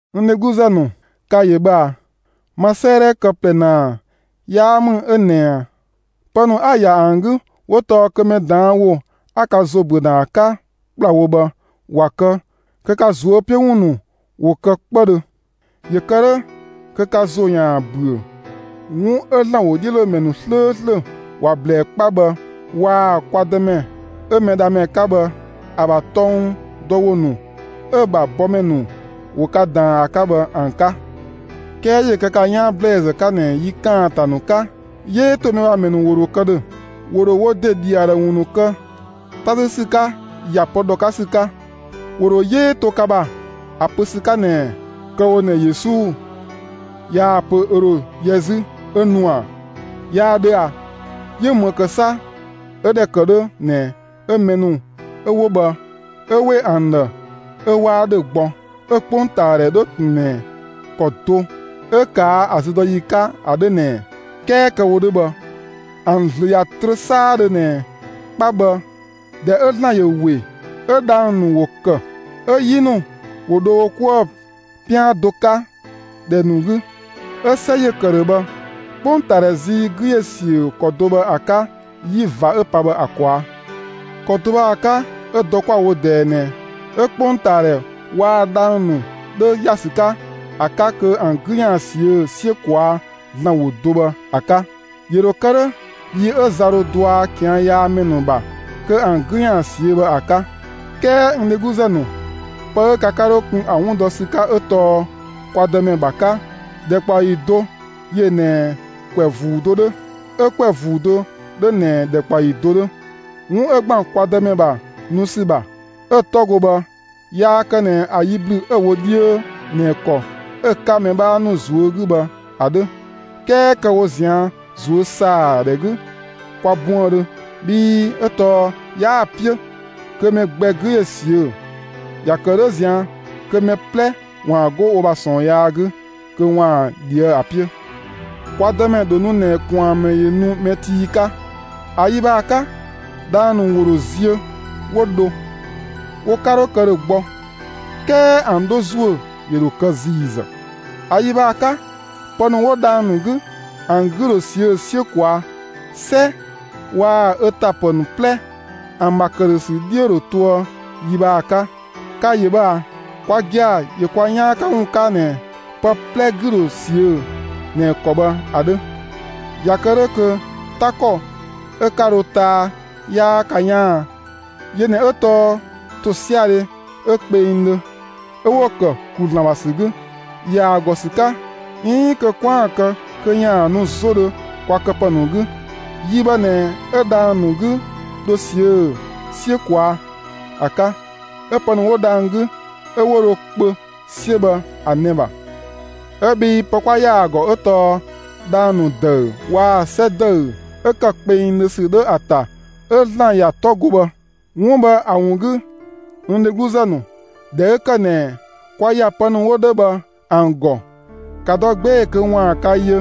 N dhegluzë ‑nu, ka‑ ‑yö bhë ꞊a! Ma 'sëëdhɛ kë ꞊plɛ ‑naa 'yaa ‑mü 'ö ꞊nɛ ꞊a; pë ‑nu 'a‑ ‑ya ‑an 'gü 'wo tɔɔ kö mɛ ꞊daan' ‑wo 'a ka ‑zo ‑büö ‑na ‑a 'ka ‑kplawo bhë ‑wa kë kö ka ꞊zuö' 'piö ‑wun ‑nu ‑wo kë 'kpëdhö, ‑yö kë 'dhö kö ka ‑zo ‑yaan ‑büö 'wun 'ö ‑Zlan ‑wodhiölomɛ ‑nu 'slööslö ‑wa ꞊blɛɛ 'kpa bhë waa‑ kwa Dëmɛ 'ö Mɛdhamɛ 'ka bhë ‑a ‑bha tɔng dɔ ‑wo ‑nu 'ö‑ ‑bha bɔmɛ ‑nu ‑wo ka ‑daan ‑a 'ka bhë ‑an 'ka. 'Kɛɛ ‑yö kë ka 'yaan ‑blɛɛzë 'ka ꞊nɛ yi ‑kaanta ‑nu 'ka, 'yee ‑to mɛ ‑bha ‑mɛ ‑nu ‑wo ‑dho kë ‑dhö; ‑wo ‑dho wo ‑de ‑dhi ‑a ‑dhë ‑wun ‑nu kë 'ta 'sü ‑sü 'ka ‑ya pë ‑dhɔ 'ka ‑sü 'ka. ‑Wo ‑dho 'yee to ka ‑bha ‑a pö ‑sü 'ka ꞊nɛ: «Kë‑ wo ꞊nɛ Yesu yaa‑ pö ö ‑dho yɛ ö 'zü 'ö nu ꞊a? 'Yaa 'dhö a? ‑Yö 'më 'sa 'ö ‑dhɛ ‑kë 'dhö ꞊nɛ 'ö mɛ ‑nu 'ö ‑wo bhë 'ö ‑we ‑an ‑dhë 'ö 'waa ‑dhö gbɔ, 'ö 'kpongtaadhɛ 'dhö ꞊tun ꞊nɛ ‑kɔ do 'ö ꞊kaa' ‑a züdɔyi 'ka ‑a 'dhö ꞊nɛ ꞊ɛ?» 'Kɛɛ kë‑ wo 'dhö bhë, ‑an ‑zlö ꞊ya trö 'saadhö ꞊nɛ 'kpa bhë, ꞊dhɛ 'ö ‑Zlan ‑yö ‑we, 'ö dhang‑ ‑nu ‑wo ‑kë, 'ö 'yi ‑nu ‑wo dho wo 'kuë‑ 'pian do 'ka ‑dhɛ ‑nu 'gü, 'ö 'sɛ ‑yö ‑kë ‑dhö bhë, 'kpongtaadhɛ zii 'gü ‑yö ‑siö ‑kɔ do bhë ‑a 'ka 'yi ꞊va 'ö‑ pa bhë ‑a ꞊kwaa'. ‑Kɔ do bhë ‑a 'ka 'ö dɔ 'kwa‑ wo ꞊dɛɛ ꞊nɛ 'ö 'kpongtaadhɛ waa‑ dhang‑ ‑nu 'dhö ‑ya ‑sü 'ka ‑a 'ka kö ‑an 'gü ‑yaan ꞊siö' 'siö ꞊kwaa' ‑Zlan ‑wo do bhë ‑a 'ka. ‑Yö ‑dho kë 'dhö yi 'ö za dho dɔa ꞊kian' yaa ‑mɛ ‑nu ‑bha kö ‑an 'gü ‑yaan ꞊siö' bhë ‑a 'ka. 'Kɛɛ n dhegluzë ‑nu, pë 'ö ka 'ka 'dho kun ‑a ‑wun dɔ ‑sü 'ka 'ö tɔɔ kwa Dëmɛ ‑bha 'ka, ‑dhɛkpaɔyi do ‑yö ꞊nɛ ‑kwɛ ‑vuu do 'dhö, 'ö ‑kwɛ ‑vuu do 'dhö ꞊nɛ ‑dhɛkpaɔyi do 'dhö. 'Wun ('ö ‑gban kwa Dëmɛ ‑bha nu ‑sü ‑bha) 'ö‑ 'tɔ go bhë, yaa kë ꞊nɛ ‑a yi ‑blü 'ö‑ wo 'dhiö ꞊nɛ ‑kɔ 'ö‑ 'ka mɛ 'bhaa ‑nu ꞊zuö' 'gü bhë ‑a 'dhö; 'kɛɛ kë‑ wo ꞊zian' ꞊zuösaadhɛ 'gü kwa buëndhö, bhii 'ö tɔɔ 'yaa‑ 'piö kö mɛ gbɛ 'gü ‑yö ꞊siö'; ‑ya ‑kë 'dhö ꞊zian' kö mɛ 'plɛ ‑waan 'go wo ‑bha ꞊sɔɔn yaa 'gü, kö ‑waan ꞊dhië'‑ ‑a 'piö. Kwa Dëmɛ ‑dho nu ꞊nɛ ꞊kwaanmɛ ‑yö nu mɛ tii 'ka. ‑A yi bhë ‑a 'ka, dhang‑ ‑nu ‑wo ‑dho ziö 'wo dho; wo 'ka 'dho kë ‑dhö gbɔ. 'Kɛɛ ‑an 'dho ‑zuö ‑yö ‑dho kë ‑ziizë. ‑A yi bhë ‑a 'ka, pë ‑nu 'wo dhang‑ ‑nu 'gü, ‑an 'gü ‑dho ꞊siö' 'siö ꞊kwaa'; 'sɛ waa‑ ö ‑ta ‑pë ‑nu 'plɛ, ‑an ‑bha ‑këdhösü 'dhiö ‑dho toë yi bhë ‑a 'ka. Ka‑ ‑yö bhë ꞊a! Kwa gia‑ ‑yö kwa 'yaan 'ka ‑wun 'ka ꞊nɛ pë 'plɛ 'gü ‑dho ꞊siö' ꞊nɛ ‑kɔ bhë ‑a 'dhö. ꞊Ya kë 'dhö kö 'ta ‑kɔ 'ö 'ka dho taa 'yaa ka 'yaan a? Yö ꞊nɛ 'ö tɔɔ ‑tosiadhe 'ö kpengdhö 'ö 'wo‑ ‑kë ‑klu ‑Zlan ‑bha ‑sü 'gü, ‑ya ‑a ‑gɔ ‑sü 'ka, 'iin kö 'kwaan‑ kë kö ‑yaan nu 'zodhö kwa këpë ‑nu 'gü. Yi bhë ꞊nɛ 'ö dhang‑ ‑nu 'gü dho ꞊siö' 'siö ꞊kwaa' ‑a 'ka, 'ö pë ‑nu 'wo dhang‑ 'gü 'ö 'wo dho kpö 'siö bhë ‑a nɛ‑ ‑bha. 'Ö bhii pë 'kwa ‑ya ‑a ‑gɔ 'ö tɔɔ dhang‑ ‑nu ‑dëü waa‑ 'sɛ ‑dëü 'ö ‑kë kpengdhö ‑sü 'dhö ‑a ‑ta 'ö ‑Zlan ‑ya 'tɔ go bhë. 'Wun bhë ‑a ‑wun 'gü, n dhegluzë ‑nu, ꞊dhɛ 'ö ‑kë ꞊nɛ kwa ‑ya pë ‑nu 'wo 'dhö bhë ‑an ‑gɔ, ‑ka dɔ 'gbee‑ kö ‑waan ka yö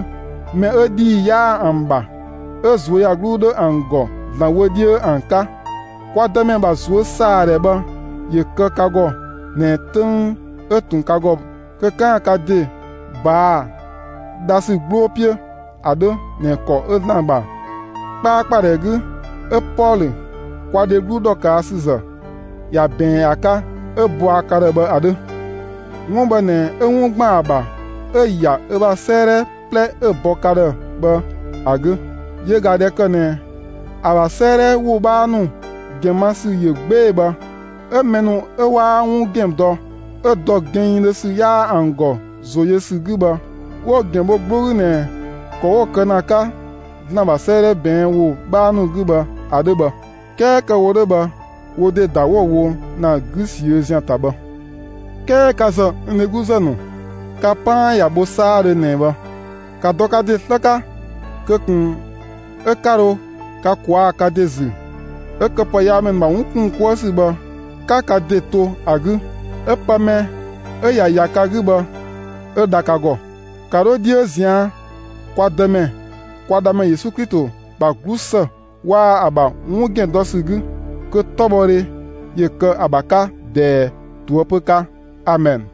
mɛ 'ö ‑dhii 'yaa ‑an ‑bha, 'ö ꞊zuöyagluu 'dhö ‑an ‑gɔ ‑Zlan wö 'dhiö ‑an 'ka. Kwa Dëmɛ ‑bha ꞊zuösaadhɛ bhë ‑yö kë ka ‑gɔ ꞊nɛ 'töng 'ö ꞊tun ka ‑gɔ kö 'kaan‑ ka ‑de ꞊baa'‑ dhasü 'gbloo 'piö ‑a 'dhö ꞊nɛ ‑kɔ 'ö ‑Zlan ‑bha 'kpaakpadhɛ 'gü 'ö Pɔlö, kwa dheglu ‑dhɔkaasüzë ‑ya ꞊bɛɛn ‑a 'ka 'ö‑ bɔa ka ‑dhë bhë ‑a 'dhö. 'Wun bhë ꞊nɛ 'ö 'wun ‑gban ‑a ‑bha 'ö‑ ‑ya ö ‑bha 'sëëdhɛ 'plɛ 'ö‑ bɔ ‑na ka ‑dhë bhë ‑a 'gü. Yö ꞊ga ꞊dhɛ ‑kë ꞊nɛ ‑a ‑bha 'sëëdhɛ ‑wo 'bhaa ‑nu ‑gɛn ma ‑sü ‑yö 'gbee‑ bhë, 'ö mɛ ‑nu 'ö 'waa 'wun ‑gɛn dɔ 'ö ‑dɔ gɛnngdhö ‑sü 'yaa ‑an ‑gɔ ‑zo yö ‑sü 'gü bhë, 'wo‑ ‑gɛn bho 'gbloo 'gü ꞊nɛ ‑kɔ 'wo‑ kë ‑na ‑a 'ka ‑Zlan ‑bha 'sëëdhɛ ꞊bɛɛn' ‑wo 'bhaa ‑nu 'gü bhë ‑a 'dhö bhë. 'Kɛɛ kë‑ wo 'dhö bhë, wo ‑de ‑da 'wo‑ wo ‑na 'gü ꞊siö' ‑zian ‑ta bhë. 'Kɛɛ ka ‑zë, n dhegluzë ‑nu, ka 'paan ꞊ya bho 'saadhö ꞊nɛ bhë; ‑ka dɔ ka ‑de 'slë 'ka kö ꞊kun 'ö 'ka dho ka ꞊kwaa' ka ‑de ‑zü 'ö këpëyaamɛ ‑nu ‑bha 'wun ‑kun 'kuë ‑sü bhë 'ka ka ‑de to ‑a 'gü 'ö pë mɛ 'ö ꞊ya ‑ya ka 'gü bhë 'ö dha ka ‑gɔ. ‑Ka 'dho 'dhiö ꞊zian' kwa Dëmɛ, kwa Dhamɛ Yesu Klito ‑bha 'glusë waa‑ ‑a ‑bha 'wun ‑gɛn dɔ ‑sü 'gü. Kö 'tɔbhɔdhe ‑yö kë ‑a ‑bha 'ka ꞊dɛɛ, ꞊toëpö 'ka! Amɛn.